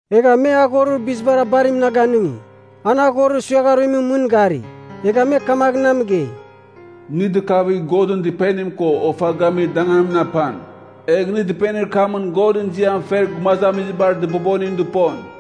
Egha me aghorir bizibar abarim na ganɨngi, an aghorir suiagharuimɨn mɨn gari, egha me kamagh na mɨgei, “Nɨ dɨkavigh Godɨn Dɨpenim ko ofa gamir danganimɨn apan. Egh nɨ dɨpenir kamɨn Godɨn ziam fer gumazamizibar dɨbobonim dɨpon.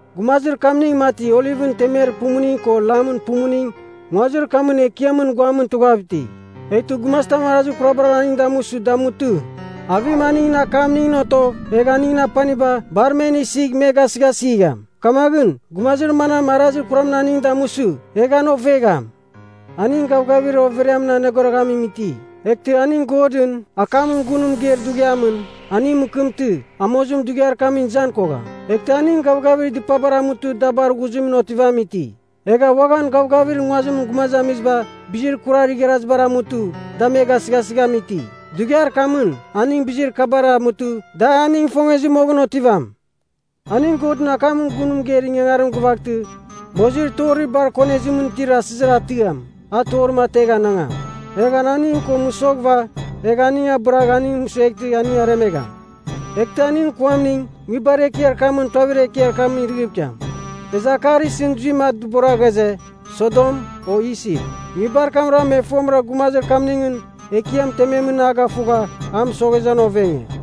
Gumazir kamning mati olivɨn temer pumuning ko lamɨn pumuning nguazir kamɨn Ekiamɨn guamɨn tughav iti. Eghtɨ gumazitam arazir kurabar aning damusɨ, damutɨ, avim aningɨn akamningɨn otogh egh aningɨn apaniba, bar men isigh me gasɨghasigham. Kamaghɨn, gumazir manam arazir kuramɨn aning damusɨ, egh an ovegham. Aning gavgavir overiamɨn aneghoroghamim iti, eghtɨ aning Godɨn akamɨn gun mɨgeir dughiamɨn, aning mɨkɨmtɨ, amozim dughiar kamɨn izan kogham. Eghtɨ aning gavgavir dɨpabar amutɨ da bar ghuzimɨn otivamim iti. Egha uaghan gavgavir nguazimɨn gumazamiziba bizir kurar igharazibar amutɨ da me gasɨghasɨghamim iti. Dughiar kamɨn, aning bizir kabara amutɨ da aning ifongezɨ moghɨn otivam. Aning Godɨn akamɨn gun mɨgeir ingangarim gɨvaghtɨ mozir torir bar konezimɨn itir asɨzir atiam, a torim ategh anangam. Egh an aning ko mɨsoghɨva, egh aning abɨragh aning mɨsueghtɨ aning aremegham. Eghtɨ aningɨn kuamning nguibar ekiar kamɨn tuavir ekiamɨn irɨghɨv ikiam. E akar isɨn zuimɨn a dɨbora ghaze, Sodom o Isip. Nguibar kamra me fomɨra gumazir kamningɨn Ekiam tememɨn a gafugha a mɨsoghezɨ an ovenge.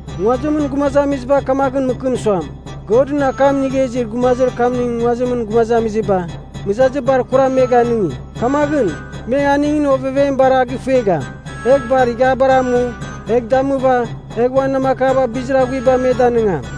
Nguazimɨn gumazamiziba kamaghɨn mɨkɨm suam, Godɨn akam inigha izir gumazir kamning nguazimɨn gumazamiziba mɨzazir bar kuram me ganɨngi. Kamaghɨn, me aningɨn ovevem bar a gifuegham, egh bar ighiabar amu, egh damɨva egh uan namakaba bizir aghuiba me danɨngam.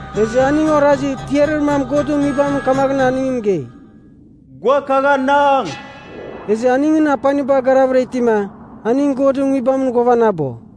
Ezɨ aning orazi tiarir mam Godɨn Nguibamɨn kamaghɨn aning mɨgei, “Gua kagh anang.” Ezɨ aningɨn apaniba garavɨra itima, aning Godɨn Nguibamɨn ghuavanabo.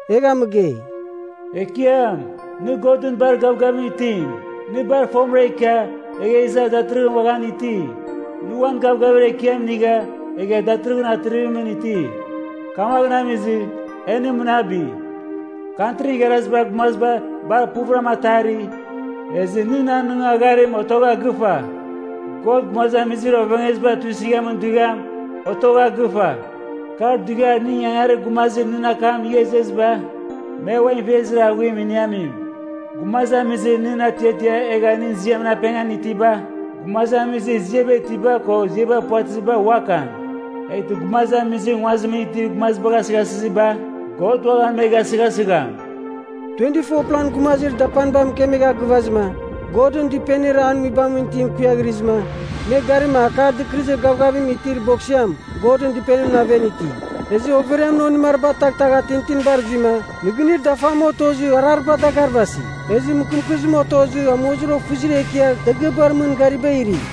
Egha mɨgei, “Ekiam, nɨ Godɨn bar gavgavim itim. Nɨ bar fomɨra ikia egha iza datɨrɨghɨn uaghan iti. Nɨ uan gavgavir ekiam inigha egha datɨrɨghɨn atrivimɨn iti. Kamagh amizɨ, e nɨ mɨnabi. Kantrin Igharazibar Gumaziba bar puvɨram atari, ezɨ nɨn anɨngagharim otogha gɨfa. God gumazamizir ovengeziba tuisɨghamin dughiam, otogha gɨfa. Kar dughiar nɨn ingangarir gumazir nɨn akam inigha izeziba, me uan ivezir aghuim iniamim. Gumazamizir nɨn atiatia egha nɨn ziamɨn apengan itiba, gumazamizir ziaba itiba ko ziaba puvatɨziba uakan. Eghtɨ gumazamizir nguazimɨn itir gumazibagh asɨghasɨziba, God uaghan me gasɨghasɨgham.” 24plan gumazir dapaniba mɨkemegha gɨvazɨma, Godɨn Dɨpenir an nguibamɨn itim kuiaghrɨzɨma, me garima Akar Dɨkɨrɨzir Gavgavim itir Boksiam Godɨn Dɨpenimɨn aven iti. Ezɨ overiamɨn onɨmariba taghtagha tintinibar zuima, nɨgɨnir dafam otozɨ, arariba dagarvasi, ezɨ mɨkɨmkɨzim otozɨ amozir ofɨzir ekiar dagɨabar mɨn gariba iri.